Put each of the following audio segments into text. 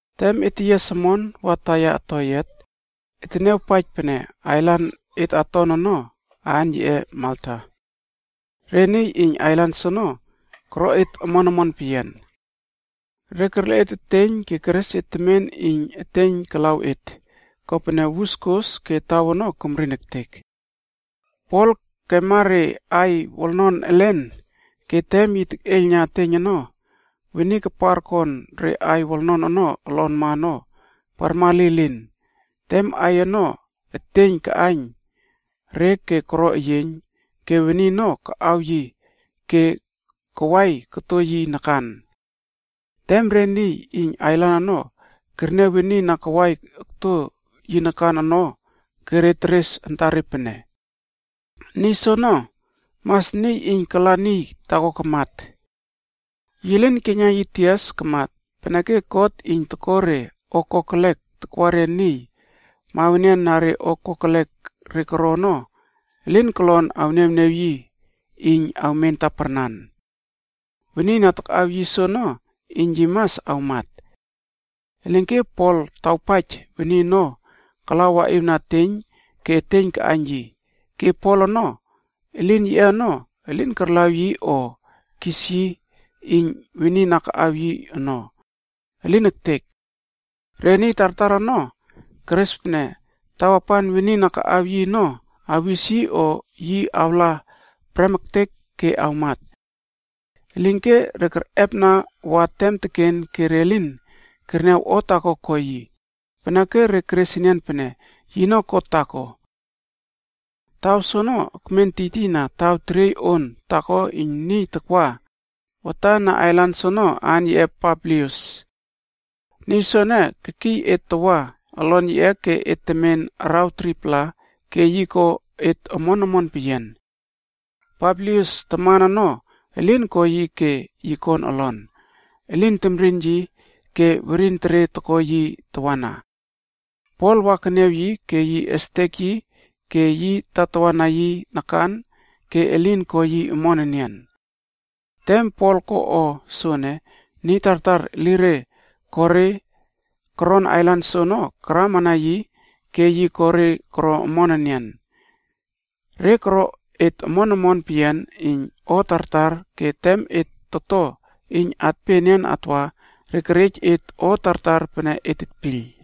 Tem et teyias omon wa taiya toyiat, et teniawpaij pene ailan et aton ono aan yiꞌe Malta. Re niy iyn ailan soono koro et omon omon peyian. Re kerle et eteiyn ke keres et temen iyn eteiyn kalaw et, kopene wus tokos ke taw ono kemrin ektek. Pol kemma re aiy wolnon elen ke tem yi tekꞌeiylna eteiyn ono, weni kapar kon re aiy wolnon ono olonma ono parma lilin tem aiy ono eteiyn kaꞌaiyn re ke koro eyieiyn, ke weni ono kaꞌaw yi ke kawai koto yi nakan. Tem re niy iyn ailan ono kerniaw weni na kawai okto yi nakan ono ke teres re antare pene, “Niy soono mas niy iyn kala niy taako kamat. Yi lin keiyna yi tias ke kamat, peneke god iyn toko re o kokelek takwana re niy mawenian na re o kokelek re koro ono elin kolon awniawniaw yi iyn awmen taparnan. Weni na takꞌaw yi soono iyn yi mas awmat.” Elinke Pol tawpaij weni ono kala waꞌiwna eteiyn ke eteiyn kaꞌaiyn yi, ke Pol ono elin yiꞌe ono elin karlaw yi o kis yi iyn weni na kaꞌaw yi ono. Elin ektek. Re niy tartar ono keres pene tawapan weni na kaꞌaw yi ono awis yi o yi awla prem ektek ke awmat. Elinke re kerꞌepna wa tem teken ke re lin kerniaw o taako ko yi, peneke re keres enian pene yino god taako. Taw soono ekmen tiytiyna taw teriey on taako iyn niy takwa watan na ailan soono aan yiꞌe Publius. Niy soene kekiy et tawa olon yiꞌe ke et temen araw 3-pla ke yi ko et omon omon peyian. Publius taman ono elin ko yi ke yi kon olon, elin temrin yi ke werin tere toko yi tawana. Pol wa keniaw yi ke yi estek yi ke yi tatawa na yi nakan ke elin ko yi omon enian. Tem Pol ko o soene, niy tartar elire ko re koron ailan soono karama na yi ke yi ko re koro omon enian. Re koro et omon omon peyian iyn o tartar ke tem et toto iyn atpe enian atwa, re kerej et o tartar pene et tetpiyl.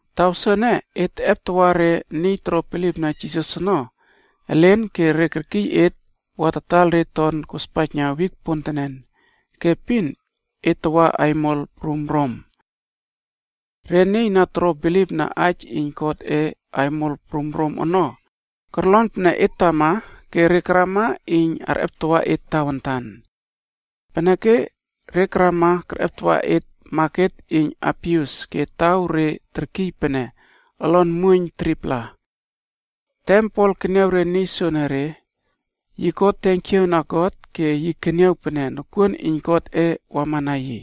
Taw soene et teꞌeptawa elen reꞌe niy toro bilipna Jisas ono ke re kerkiy empem et wa tataiyl re ton kospaijna wik pontenen ke epin et teꞌepesie re ke tawa aimol prum Rom. Re niy na toro bilipna aij iyn Godꞌe aimol prum Rom ono korlon pene et tama ke re karama iyn arꞌeptawa et tawantan. Peneke re karama kerꞌeptawa et Maket iyn Apius ke taw re terkiy pene Olon Muoiyn 3-pla. Tem Pol keniaw re niy soenere yi ko tenkiaw na God ke yi keniaw pene nokuon iyn Godꞌe wama na yi.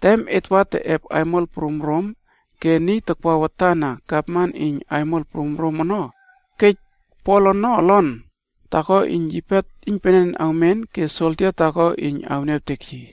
Tem et wa teꞌep aimol prum Rom ke niy takwa watan na gavman iyn aimol prum Rom ono kej Pol ono olon taako iyn yipe iynpenen awmen ke soldia taako iyn awniawtek yi.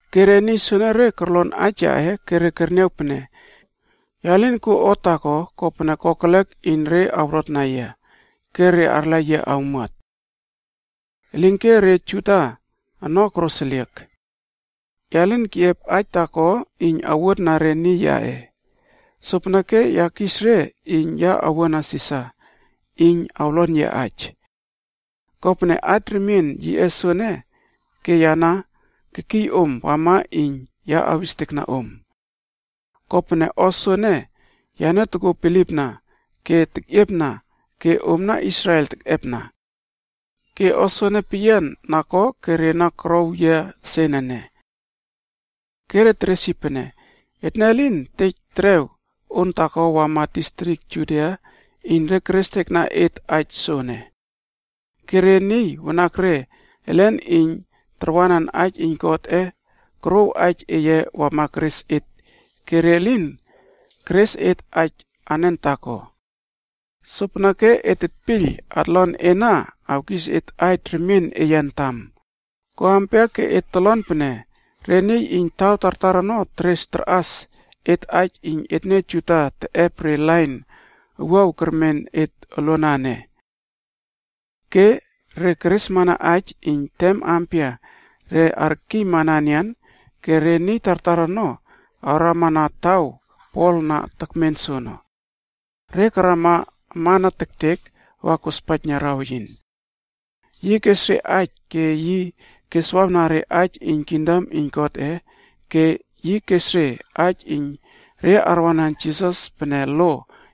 Ke re niy soenere korlon aij yaꞌe ke re kerniaw pene ya lin kuo o taako kopene kokelek iyn re awrotna yia, ke re arla yia awmuat. “Elinke re Juda ono koroseliek. Ya lin keꞌiep aij taako iyn ya awuotna re niy yaꞌe, sopeneke ya kis re iyn ya awua na Sisar iyn awlon yia aij. Kopene aij remien yiꞌe soene ke ya na kekiy empem om wama iyn ya awis oktow om. Kopene o soene yane tokuo bilipna ke tekꞌiepna ke omna Israel tekꞌepna. Ke o soene peyian na ko ke re na korow yia sen ene.” Ke re teres yi pene, “Etne lin tej terew on taako wama distrik Judia iyn re kerestekna et aij soene. Ke re niy wanakre elen iyn tarwanan aij iyn Godꞌe korouw aij eye wama keres et ke re lin keres et aij anen taako. Sopeneke et tetpiyl atlon ena awkis et aij remien eye antam, ko ampia ke et tolon pene re niy iyn taw tartar ono teres tarꞌas et aij iyn etne Juda teꞌep re lain owuaw kermen et oluana ene.” Ke re keresmana aij iyn tem ampia re arkiymana enian ke re niy tartar ono awrama na taw Pol na tekmen soono. Re karama amana tektek wa tokospaijna raweyin. Yi kes re aij ke yi keswawna re aij iyn kingdom iyn Godꞌe ke yi kes re aij iyn re arwanan Jisas pene lo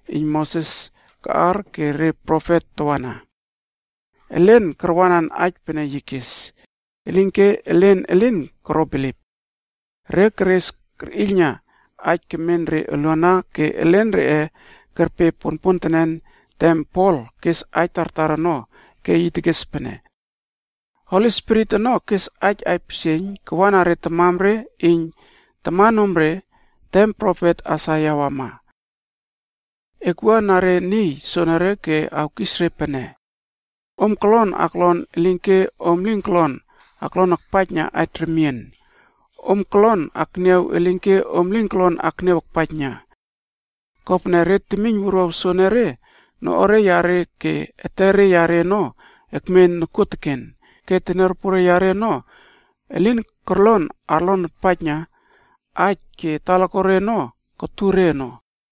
iyn Moses kaꞌar ke re profet tawana. Elen karwanan aij pene yi kes, elinke elen elin koro bilip. Re keres kerꞌiylna aij kemen re uluana ke elen reꞌe kerpe ponpontenen tem Pol kes aij tartar ono ke yi tekes pene, “Holi Spirit ono kes aij aipisieiyn kawa na re tamare iyn tamanomre tem profet Aisaia wama. ‘Ekwua na re niy soenere ke e awkis re pene, “Om kolon aklon elinke om lin kolon aklon akpaijna aij remien, om kolon akniaw elinke om lin kolon akniaw akpaijna. Kopene re temiyn wuruaw soenere, noꞌuare yare ke etere yare ono ekmen nokuoteken ke teniaropore yare ono elin korlon arpaijna aij ke talakuare ono kutur re ono.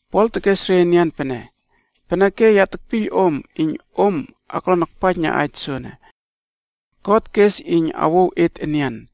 Pol tekes re enian pene, “Peneke, ya tekpiyl om iyn om aklon akpaijna aij soene. God kes iyn yi awouw et enian.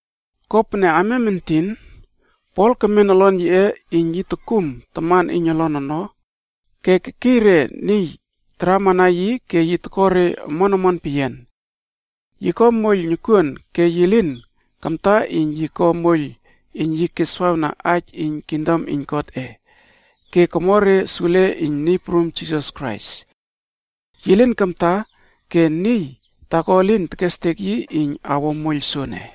Kopene amiam entinc Pol kemen olon yiꞌe iyn yi tokum taman iyn olon ono ke kekiy re niy taramana yi ke yi toko re omon omon peyian. Yi ko moiyl nokuon ke yi lin kamta iyn yi ko moiyl iyn yi keswawna aij iyn kingdom iyn Godꞌe ke komo re sule iyn Niy Prum Jisas Krais. Yi lin kamta ke niy taako elin kestek yi iyn awo moiyl soene.